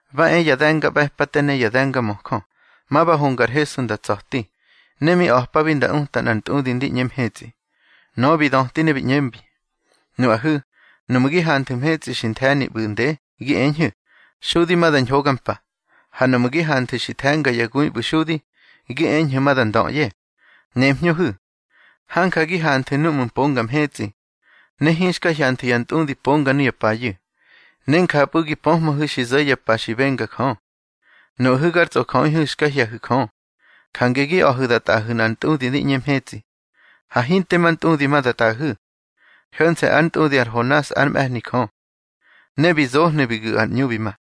Ba e ya de̱ngaꞌbe̱pate ne ya de̱ngamöjö, ma ba honga ar Hesu nda tsa̱ti, ne mi a̱pabi nda uta nꞌar ntꞌudi ndi ꞌñe mhetsꞌi. Nöꞌö bi döti ne bi ꞌñembi: —Nuꞌahu̱, nuꞌmu̱ gi hanthu̱ mhetsꞌi xi nthe̱ni ꞌbu̱ nde, gi eñhu̱: Xudi ma da ñhoga mpa. Ha nuꞌmu̱ gi hanthu̱ xi the̱nga ya gui ꞌbu̱ xudi, gi eñhu̱ ma da ndöꞌye. Nemhñöhu̱, hanja gi hanthu̱ núꞌmu̱ mponga mhetsꞌi, ne hinxka hyanthu̱ ya ntꞌudi ponga nuya payu̱, ne njapꞌu̱ gi pöhmöhu̱ xi zo̱ ya pa xi benga Jö. Nuꞌahu̱ gar tsꞌojöꞌihu̱ xka hye̱hu̱ Jö, jange gi a̱hu̱ da tꞌaꞌahu̱ nꞌar ntꞌudi di ꞌñe mhetsꞌi. Ha hinte ma ntꞌudi ma da tꞌaꞌahu̱, ho̱nse̱ ár ntꞌudi ar Honas ár mꞌe̱hni Jö. Ne bi zohnu̱ bi gu̱ ar ꞌñu bi ma.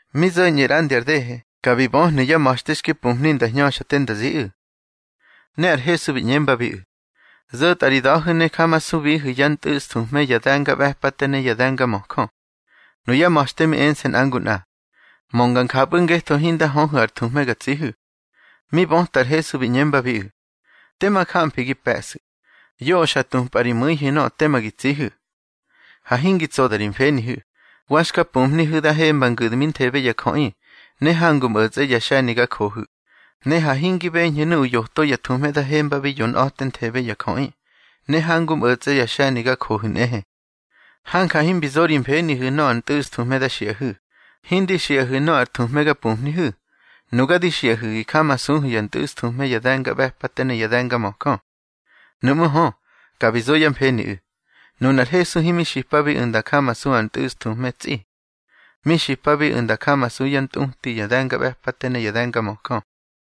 Mi zo̱ñꞌu̱ ꞌrandi ar dehe, ka bi böhnu̱ yá ma̱xte xki mpumhni nda hñöxa te nda ziꞌu̱. Ne ar Hesu bi ꞌñembabiꞌu̱: —Zo̱tꞌa ri da̱hu̱ ne jamasubihu̱ yá ntꞌu̱sthuhme ya de̱ngaꞌbe̱pate ne ya de̱ngamöjö. Nuyá ma̱xte mi ense̱ nꞌa ngu nꞌa: —Mönga njapꞌu̱ ngetho hinda höhu̱ ar thuhme ga tsihu̱. Mi böta ar Hesu bi ꞌñembabiꞌu̱: —Tema jamfi gi pe̱ꞌsu̱. Yoꞌö xa tupꞌa ri mu̱ihu̱ nöꞌö tema gi tsihu̱. Ha hingi tsoda ri mfenihu̱. Wa xka pumhnihu̱ da hemba ngu̱dminthebe ya jöꞌi, ne hangu mꞌo̱tsꞌe ya xe̱ni ga johu̱. Ne ha hingi beñhu̱ nuꞌu̱ yoto ya thuhme da hembabi yonꞌa̱tenthebe ya jöꞌi, ne hangu mꞌo̱tsꞌe ya xe̱ni ga johu̱ nꞌehe. Hanja himbi zo ri mfenihu̱ nöꞌö ar ntꞌu̱sthuhme da xiꞌahu̱. Hindi xiꞌahu̱ nöꞌö ar thuhme ga pumhnihu̱. Nuga di xiꞌahu̱ gi jamasuhu̱ yá ntꞌu̱sthuhme ya de̱ngaꞌbe̱pate ne ya de̱ngamöjö. Nuꞌmú̱ hö, ka bi zo yá mfeniꞌu̱, nunar Hesu himi xipabiꞌu̱ nda jamasu ar ntꞌu̱sthuhme tsꞌi. Mi xipabiꞌu̱ nda jamasu yá ntꞌuti ya de̱ngaꞌbe̱pate ne ya de̱ngamöjö.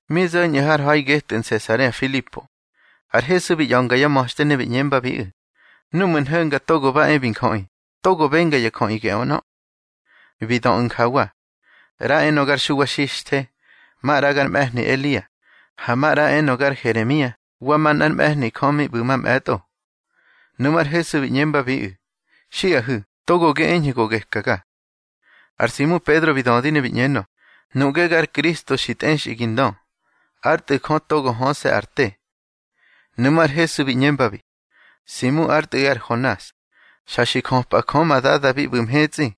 Mi zo̱ñꞌu̱ har ha̱i getꞌu̱ Nsesarea Filipo, ar Hesu bi ꞌya̱nga yá ma̱xte ne bi ꞌñembabiꞌu̱: —Núꞌmu̱ nho̱nga Togo ba e bi Njöꞌi, togo benga ya jöꞌi geꞌö ꞌnö. Bi döꞌu̱ njawa: —ꞌRa enö gar Xuwa Xixthe. Maꞌra gar mꞌe̱hni Elia, ha maꞌra enö gar Heremia wa manꞌár mꞌe̱hni Jö mi ꞌbu̱ mamꞌe̱tꞌo. Nuꞌmú̱ ar Hesu bi ꞌñembabiꞌu̱: —Xiꞌahu̱, togo gi eñhu̱ go gekaga. Ar Simu Pedro bi dödi ne bi ꞌñenö: —Nuꞌge gar Kristo xi tꞌexꞌi gi ndö, ár Tꞌu̱ Jö togo höse̱ ar te. Nuꞌmú̱ ar Hesu bi ꞌñembabi: —Simu ár tꞌu̱ꞌi ar Honas, xa xi jöpꞌa Jö ma Dada bi ꞌbu̱ mhetsꞌi,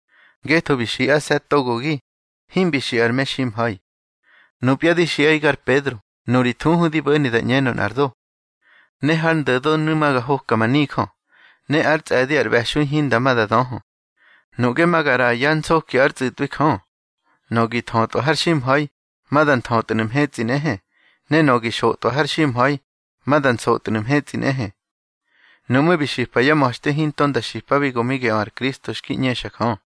ngetho bi xiꞌase̱ togogi, himbi xiꞌa ar meximha̱i. Nupya di xiꞌaꞌi gar Pedro, nuri thuhu di bo̱ni da ꞌñenö nꞌar do. Ne har ndo̱donu̱ ma ga hoka ma nijö, ne ár tsꞌe̱di ar ꞌbe̱xui hinda ma da döhö. Nuꞌge ma ga ꞌraꞌa yá nsoki ár tsꞌu̱tꞌwi Jö. Nöꞌö gi thötꞌwa har ximha̱i, ma da nthötnu̱ mhetsꞌi nꞌehe, ne nöꞌö gi xotꞌwa har ximha̱i, ma da nsotnu̱ mhetsꞌi nꞌehe. Nuꞌmú̱ bi xipa yá ma̱xte hinto nda xipabi go mi geꞌö ar Kristo xki ꞌñexa Jö.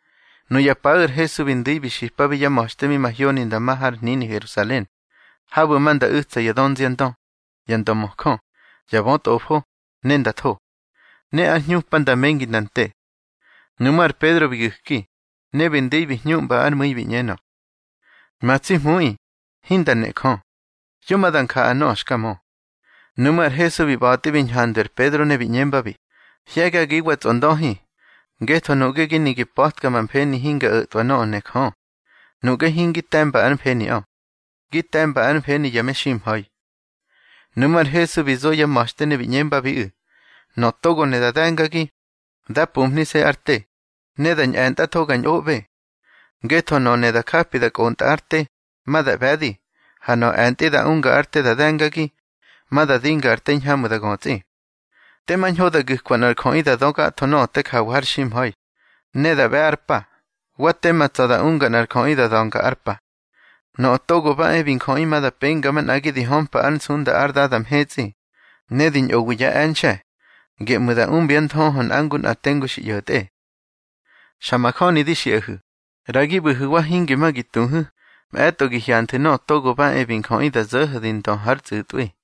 Nuya paꞌu̱ ar Hesu bi ndu̱i bi xipabi yá ma̱xte mi mahyoni nda ma har hnini Herusalen, habu̱ ma nda u̱tsa ya dönziandö, ya ndömöjö, ya bötꞌofo, ne nda tho. Ne ár hñupa nda mengi nda nte. Nuꞌmú̱ ar Pedro bi gu̱ki, ne bi ndu̱i bi hñuꞌmba ár mu̱i bi ꞌñenö: —Ma tsi Hmuꞌi, hinda nejö. Yo ma da njaꞌa nöꞌö xka mö. Nuꞌmú̱ ar Hesu bi ꞌba̱tꞌi bi ñhandwi ar Pedro ne bi ꞌñembabi: —Hye̱gagiwa tsꞌondöhi, ngetho nuꞌge gi ne gi pa̱tka ma mfeni hinga o̱twa nöꞌö ne Jö. Nuꞌge hingi te̱mba ár mfeniꞌö, gi te̱mba ár mfeni ya meximha̱i. Nuꞌmú̱ ar Hesu bi zo yá ma̱xte ne bi ꞌñembabiꞌu̱: —Nöꞌö togo ne da de̱ngagi, dá pumhnise̱ ár te, ne da ñꞌe̱ntꞌatho ga ñꞌoꞌbe. Ngetho nöꞌö ne da japi da kꞌontꞌa ár te, ma da ꞌbe̱di. Ha nöꞌö e̱ntꞌi da unga ár te da de̱ngagi, ma da dinga ar te hiñhamꞌu̱ da götsꞌi. Tema ñho da gu̱kwa nꞌar jöꞌi da dö gatho nöꞌö te jawa har ximha̱i, ne da ꞌbe̱ ár pa. Wa tema tsa̱ da unga nꞌar jöꞌi da da̱nga ár pa. Nöꞌö Togo ba e bi Njöꞌi ma da penga manꞌagi di hömpa ár nsunda ár Dada mhetsꞌi, ne di ñꞌowi yá e̱nxe̱. Geꞌmu̱ ma da umbyá nthöhö nꞌa ngu nꞌa tengu xi ꞌyo̱tꞌe. Xa majöni di xiꞌahu̱, ꞌra gi ꞌbu̱hu̱wa hinge ma gi tuhu̱, mꞌe̱tꞌo gi hyanthu̱ Nöꞌö Togo ba e bi Njöꞌi da zo̱ho̱ di ndö hár tsꞌu̱tꞌwi.